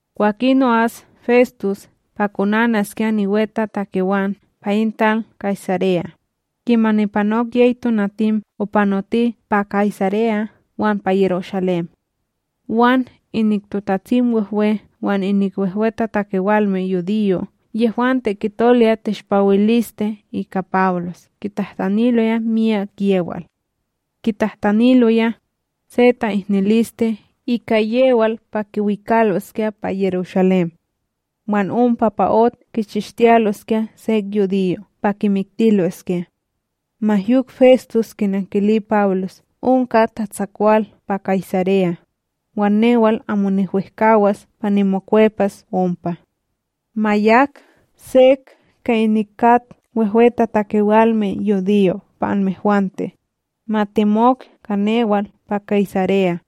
Kwakin o'as Festus pa konanaskya niwetatakewan pa in tal Kaysareya, kimani panok yey tonatim opanoti pa Kaysareya wan pa Yerushalém. Wan inik TotatsimWehwe wan inik wehwetatakewalme yudiyo' yehwante kitoloya teshpawiliste ika Pawlos kitahtaniloya miyak yewal. Kitahtaniloya, se ta'ihniliste ika yewal pa kiwikaloskya pa Yerushalém. Wan ompa pa ot kichishtiyaloskya sek yudiyo' pa kimiktiloskya; ma yok Festus kinankili Pawlos onka tatsakwal pa Kaysareya, wan newal amo niwehkAwas pa nimokwepas ompa. Ma yak: —Sek inik kat wehwetatakewalme yudiyo pa anmehwante, ma temok ka newal pa Kaysareya,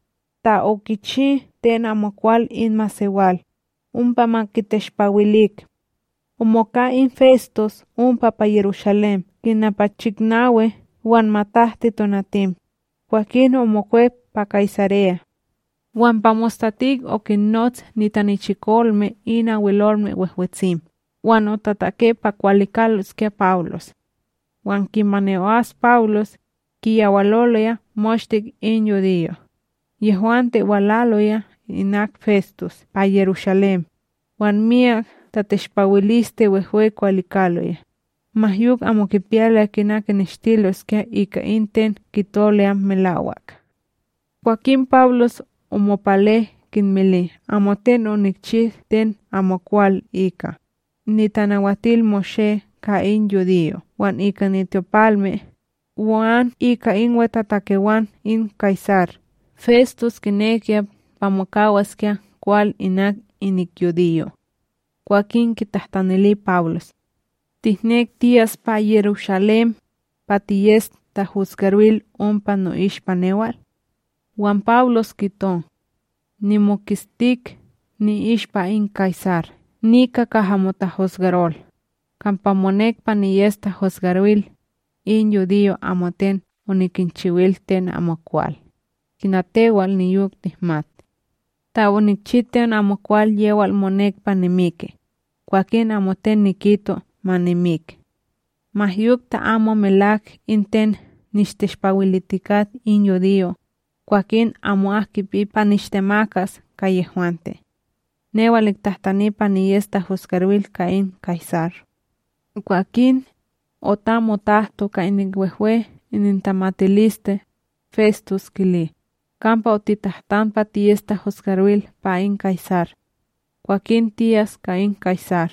ta okichi ten amokwal in masewal, ompa ma kiteshpawilik. Omoka in Festus ompa pa Yerushalém kina pa chiknawi wan matahti tonatim, kwakin omokwep pa Kaysareya. Wan pa mostatik okinnots nitanichikolme in Abwelolme Wehwetsim wan otatake pa kwalikaloskya Pawlos. Wan kimani o'as Pawlos, kiyawaloloya moshte in yudiyo', yehwante walaloya inak Festus pa Yerushalém, wan miyak tateshpawiliste wehwe kwalikaloya, ma yok amo kipiyaloya kina kineshtiloskya ika in ten kitoloya melawak. Kwakin Pawlos omopale kinmili: —Amoten onikchi ten amokwal ika, NitanawatilMoshé ka in yudiyo' wan ika nityopalme, wan ika in wetatakewan in Kaysar. Festus kinekiya pa mokawaskya kwal inak inik yudiyo', kwakin kitahtanili Pawlos: —Tihnek tiyas pa Yerushalém, pa tiyes tahusgaril ompa no'ishpa newal? Wan Pawlos kito: —Nimoketstik ni'ishpa in Kaysar nika kaha motahusgarol, kampa monek pa niyes tahusgaril. In yudiyo' amoten onikinchiwil ten amokwal, kina tewal niyok tihmat. Ta onikchi ten amokwal yewal monek pa nimiki, kwakin amoten nikito ma nimik; ma yok ta amo melawak in ten nishteshpawilitikat in yudiyo', kwakin amo'ak kipi pa nishtemakas ka yehwante. Newal nitahtani pa niyes tahusgaril ka in Kaysar. Kwakin, otam otahto ka inik wehwe inintamatiliste, Festus kili: —Kampa otitahtan pa tiyes tahosgaril pa in Kaysar. Kwakin tiyas ka in Kaysar.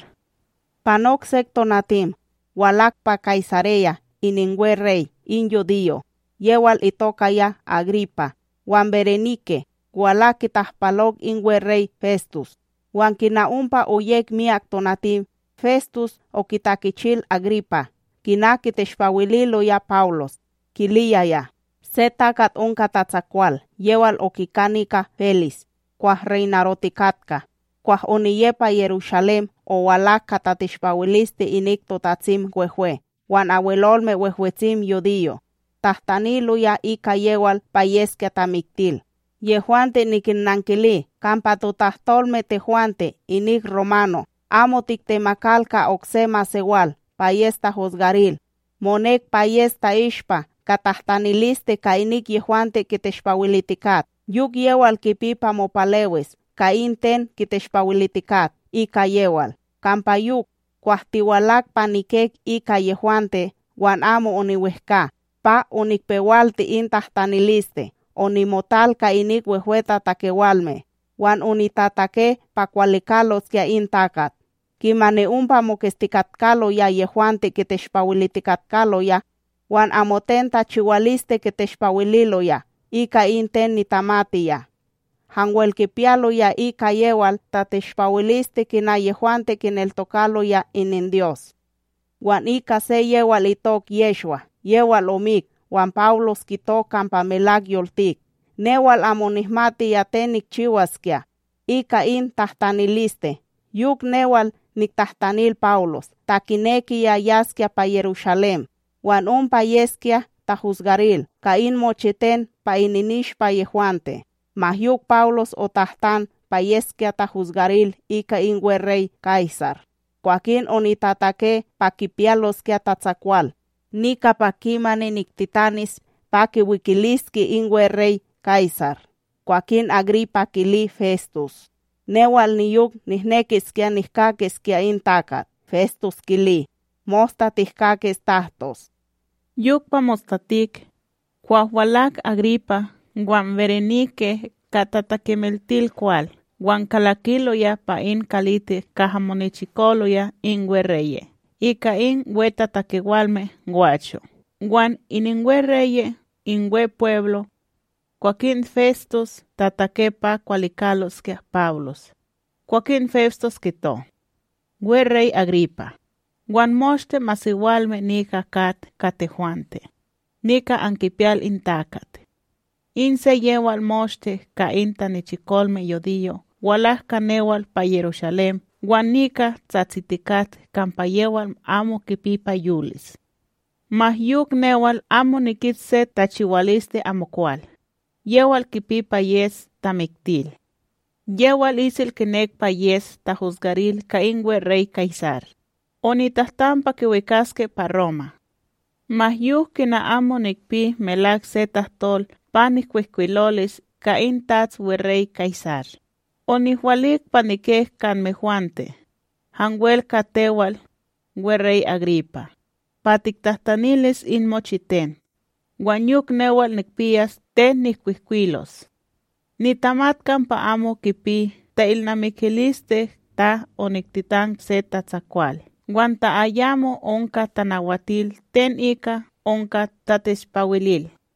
Panok sek tonatim, walak pa Kaysareya ininweRey in yudiyo' yewal itokaya Agripa wan Berenike walak kitahpalok in weRey Festus. Wan kina ompa oyek miyak tonatim, Festus okitakechil Agripa kina kiteshpawililoya Pawlos, kiliyaya: —Se takat onka tatsakwal yewal okika nika Félis kwah reynarotikatka. Kwah oniye pa Yerushalém, owalak ka tateshpawiliste inik TotatsimWehwe wan Abwelolme Wehwetsim yudiyo', tahtaniloya ika yewal pa yeskya tamiktil. Yehwante nikinnankili kampa totahtolme tehwante inik romano' amo tiktemakal ka okse masewal pa yes tahusgaril, monek pa yes ta'ishpa ka tahtaniliste ka inik yehwante kiteshpawilitikat, yok yewal kipi pa mopalewis ka in ten kiteshpawilitikat ika yewal. Kampa yok, kwah tiwalak pa nikek ika yehwante, wan amo oniwehkA pa onikpewalti in tahtaniliste, onimotal ka inik wehwetatakewalme wan onitatake pa kwalikaloskya in takat. Kimani ompa moketstikatkaloya yehwante kiteshpawilitikatkaloya wan amoten tachiwaliste kiteshpawililoya ika in ten nitamatiya. Hanwel kipiyaloya ika yewal tateshpawiliste kina yehwante kineltokaloya ininDyos, wan ika se yewal itok Yehshwa yewal omik wan Pawlos kito kampa melak yoltik. Newal amo nihmatiya ten nikchiwaskya ika in tahtaniliste, yok newal niktahtanil Pawlos ta kinekiya yaskya pa Yerushalém wan ompa yeskya tahusgaril ka in mochiten pa ininishpa yehwante. Ma yok Pawlos otahtan pa yeskya tahosgaril ika in weRey Kaysar, kwakin onitatake pa kipiyaloskya tatsakwal nika pa kimani niktitanis pa kiwikiliske in weRey Kaysar. Kwakin Agripa kili Festus: —Newal niyok nihnekiskya nihkakiskya in takat. Festus kili: —Mosta tihkakis tahtos. Yok pa mostatik, kwah walak Agripa wan Berenike ka tatakimiltilil kwal wan kalakiloya pa in kalitik kaha monichikoloya in weReye' ika in wehwetatakewalme gwacho wan ininweReye' in Wepweblo. Kwakin Festus tatake pa kwalikaloskya Pawlos, kwakin Festus kito: —WeRey Agripa, wan moshte masewalme nika kat ka tehwante, nika ankipiyal in takat. In se yewal moshte ka in tanichikolme yudiyo' walak ka newal pa Yerushalém wan nika tsatsitikat kampa yewal amo kipi pa yolis. Ma yok newal amo nikit se tachiwaliste amokwal, yewal kipi pa yes tamiktil; yewal isel kinek pa yes tahosgaril ka in weRey Kaysar, onitahtan pa kiwikaske pa Roma. Ma yok kina amo nikpi melak se tahtol pa nikwihkwilolis ka in tats weRey Kaysar, onihwalik pa nikek ka anmehwante, hanwel ka tewal, weRey Agripa, pa tiktahtanilis in mochiten, wan yok newal nikpiyas ten nihkwihkwilos. Nitamat kampa amo kipi ta'ilnamikiliste ta oniktitan se tatsakwal wan ta ayamo onka tanawatil ten ika onka tateshpawilil.